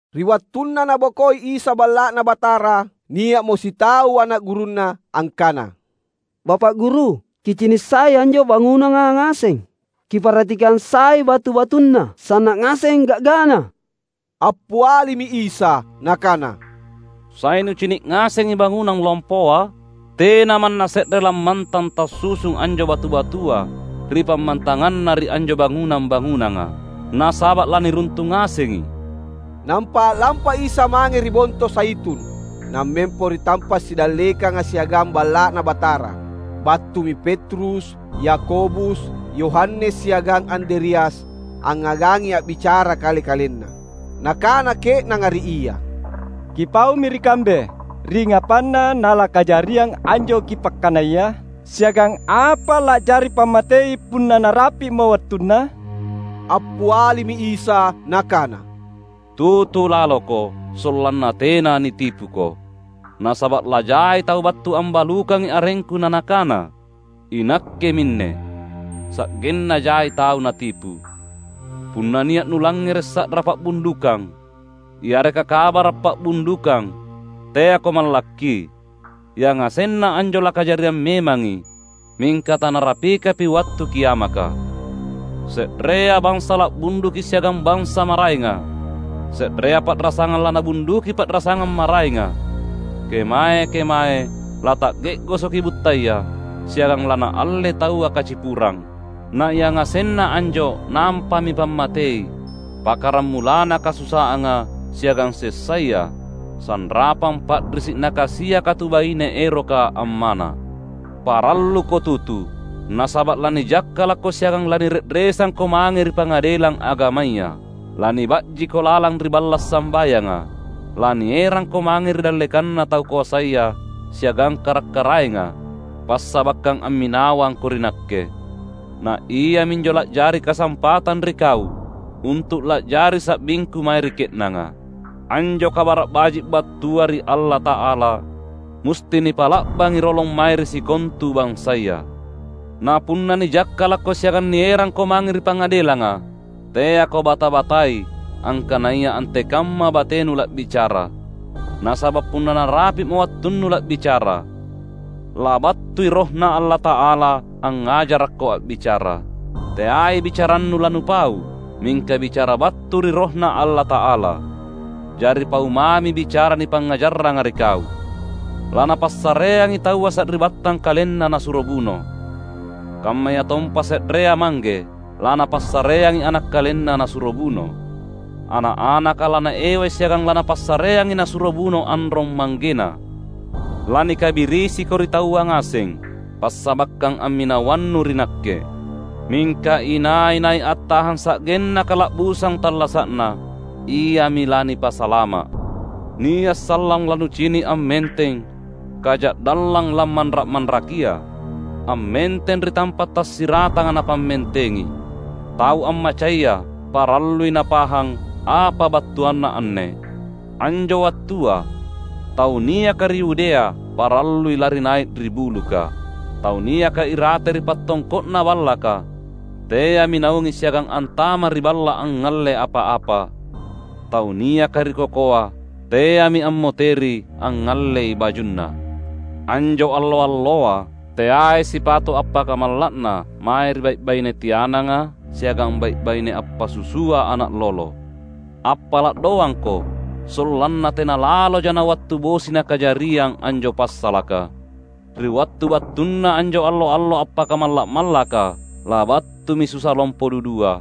Ri wattunna Nabokoi Isa Balla’Na Batara, nia’mo sitau ana’ gurunNa angkana, "Bapa’ Guru, Kicini’ sai anjo bangunanga ngaseng. Kiparhatikang sai batu-batunna sanna’ ngaseng ga’gana!" Appialimi Isa Nakana, "Sai nucini’ ngasengi bangunang lompoa? Tena manna se’re lammantang tassusung anjo batu-batua ri pammantanganna ri anjo bangunang-bangunanga. Nasaba’ laniruntung ngasengi." Nampa a’lampa Isa mange ri Bonto Zaitun, nammempo ri tampa’ sidallekanga siagang Balla’Na Batara. Battumi Petrus, Yakobus, Yohanes siagang Andreas angngagangi a’bicara kale-kalenna. Nakana ke’nanga ri Ia, "Kipaumi ri kambe, ringngapanna nalakajariang anjo Kipakkanaya? Siagang apa la’jari pammatei punna narapi’mo wattunna?" Appialimi Isa Nakana, "Tutu laloko, sollanna tena nitipuko. Nasaba’ lajai tau battu ambalukangi arengKu na nakana, ‘Inakke minne!’ Sa’genna jai tau natipu. Punna nia’ nulangngere’ sa’ra pa’bundukang, yareka kabara’ pa’bundukang, teako mallakki. Yangasenna anjo lakajariang memangi, mingka tanarapikapi wattu kiamaka. Se’rea bansa la’bunduki siagang bansa maraenga. Se’rea pa’rasangang lanabunduki pa’rasangang maraenga. Kemae-kemae lata’ge’gosoki buttaya siagang lanaallei taua kacipurang. Na yangasenna anjo nampami pammatei pakkaramulanna kasusaanga siagang sessaya sanrapang pa’risi’ nakasiaka tu baine eroka ammana’. Paralluko tutu, nasaba’ lanijakkalakko siagang lanire’resangko mange ri pangadelang agamaya. Laniba’jiko lalang ri balla’ sambayanga. Lanierangko mange ri dallekanna tau koasaya siagang kara’-karaenga, passabakkang amminawangko ri Nakke. Na iaminjo la’jari kasampatang ri kau untu’ la’jari sa’bingKu mae ri ke’nanga. Anjo Kabara’ Baji’ battua ri Allata’ala musti nipa’la’bangi rolong mae ri sikontu bansaya. Na punna nijakkalakko siagang nierangko mange ri pangadelanga, teako bata-batai angkanaya antekamma batenu la’bicara. Nasaba’ punna narapi’mo wattunnu la’bicara, labattui RohNa Allata’ala angngajarakko a’bicara. Teai bicarannu lanupau, mingka bicara battu ri RohNa Allata’ala. Jari pau mami bicara nipangngajarranga ri kau. Lanapassareangi taua sari’battang kalenna nasuro buno; kammayatompa se’rea mangge lanapassareangi ana’ kalenna nasuro buno. Ana’-anaka lanaewai siagang lanapassareangi nasuro buno anrong-manggena. Lanikabirisiko ri taua ngaseng, passabakkang amminawannu ri Nakke. Mingka inai-nai attahang sa’genna kala’busang tallasa’na, iami lanipasalama’." "Nia’ sallang lanucini’ ammenteng ‘Kaja’dallang Lammanra’-manrakia’ ammenteng ri tampa’ tasiratanga napammentengi. (Tau ammacaya parallui napahang apa battuanna anne!) Anjo wattua, tau niaka ri Yudea parallui lari nai’ ri buluka. Tau niaka irate ri pattongko’na ballaka teami naungi siagang antama’ ri balla’ angngalle apa-apa. Tau niaka ri kokoa teami ammoteri angngallei bajunna. Anjo allo-alloa teai sipato’ appakamalla’na mae ri bai’-baine tiananga siagang bai’-baine appasusua ana’ lolo! Appala’ doangko sollanna tena laloja nawattu bosi nakajariang anjo passalaka. Ri wattu battuna anjo allo-allo appakamalla’-mallaka, labattumi susa lompo dudua,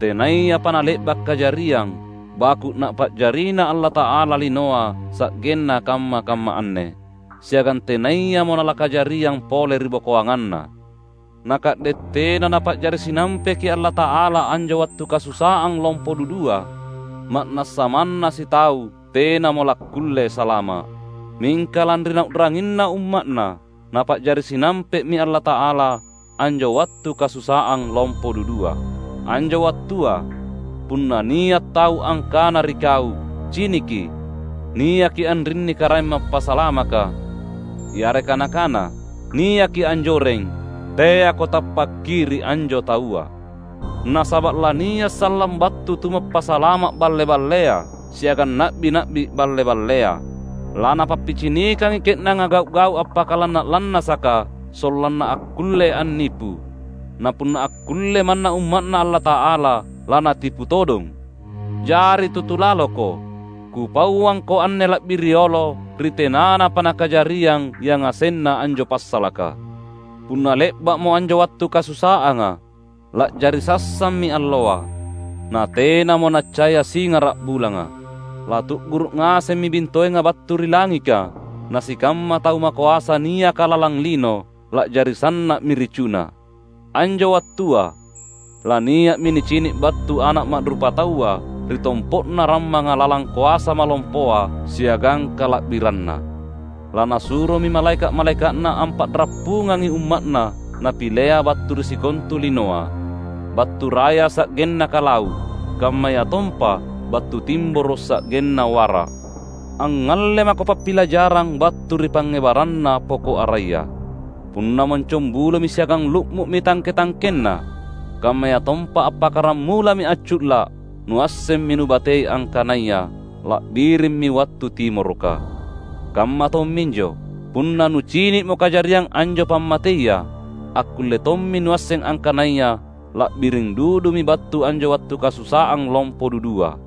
tenayapa nale’ba’ kajariang baku’ Napa’jarina Allata’ala linoa sa’genna kamma-kamma anne, siagang tenayamo nalakajariang pole ribokoanganna. Na ka’de’ tena Napa’jari sinampeki Allata’ala anjo wattu kasusaang lompo dudua, ma’nassa manna sitau tenamo lakkulle salama’. Mingka lanri Nau’ranginna umma’Na, Napa’jari sinampe’mi Allata’ala anjo wattu kasusaang lompo dudua. Anjo wattua punna nia’ tau angkana ri kau, ‘Ciniki, niaki anrinni Karaeng Mappasalamaka!’ yareka nakana, ‘Niaki anjoreng!’ — teako tappakki ri anjo taua. Nasaba’ lania’ sallang battu tumappasalama’ balle-ballea siagang na’bi-na’bi balle-ballea. Lanapappicinikangi ke’nanga gau’-gau’ appakalanna’-lannasaka sollanna akkulle annipu, na punna akkulle manna umma’Na Allata’ala lanatipu todong. Jari tutu laloko! Kupauangko anne la’bi riolo ri tenanapa nakajariang yangasenna anjo passalaka." "Punna le’ba’mo anjo wattu kasusaanga, la’jari sassammi alloa, na tenamo naccaya singara’ bulanga. Latu’guru’ ngasemmi bintoenga battu ri langika. Na sikamma tau makoasa niaka lalang lino la’jari sanna’mi ricuna. Anjo wattua lania’mi nicini’ battu Ana’ Ma’rupataua ri tompo’na rammanga lalang koasa malompoa siagang kala’biranNa. LaNasuromi malaeka’-malaeka’Na ampa’rappungangi umma’Na Napilea battu ri sikontu linoa, battu raya sa’genna kalau’, kammayatompa battu timboro’ sa’genna wara’." "Angngalle mako pappilajarang battu ri pangngebarranna poko’ araya. Punna moncongbulomi siagang lu’mu’mi tangke-tangkenna, kammayatompa appakkaramulami accu’la’, nuassemmi nubatei angkanaya la’birimmi wattu timoroka. Kamma tomminjo, punna nucini’mo kajariang anjo pammateia, akkulle tommi nuasseng angkanaya la’biring dudumi battu anjo wattu kasusaang lompo dudua.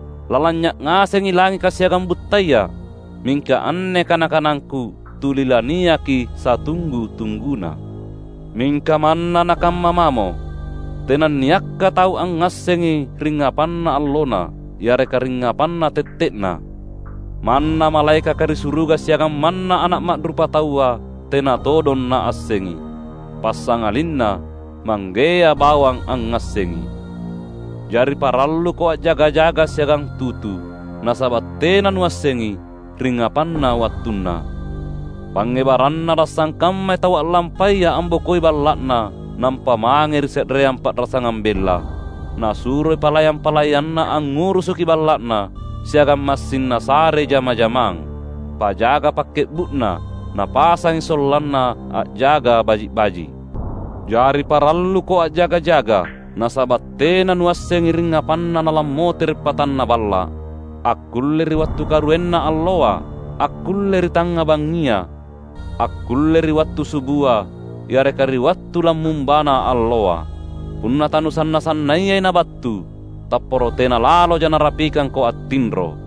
Lalanynya’ ngasengi langika siagang buttaya, mingka anne kana-kanangKu tuli laniaki satunggu-tungguna." "Mingka manna nakamma mamo, tenanniakka tau angngassengi ringngapanna allonna yareka ringngapanna tette’na. Manna malaekaka ri suruga siagang manna Ana’ Ma’rupataua tena todong Naassengi. Passangalinna Manggea bawang angngassengi. Jari paralluko a’jaga-jaga siagang tutu, nasaba’ tena nuassengi ringngapanna wattunna. Pangngebarranna lasangkammai tau a’lampaya ambokoi balla’na nampa mange ri se’reang pa’rasangang bella. Nasuroi palayang-palayanna angngurusuki balla’na, siagang massing nasarei jama-jamang. Pajaga pakke’bu’na napasangi sollanna a’jaga baji’-baji’. Jari paralluko a’jaga-jaga, nasaba’ tena nuassengi ringngapanna nalammotere’ patanna balla’. Akkulle ri wattu karuenna alloa, akkulle ri tangnga bangngia, akkulle ri wattu subua, yareka ri wattu lammumbana alloa. Punna tanusanna-sannayai nabattu, tapporo tena laloja narapikangko attinro.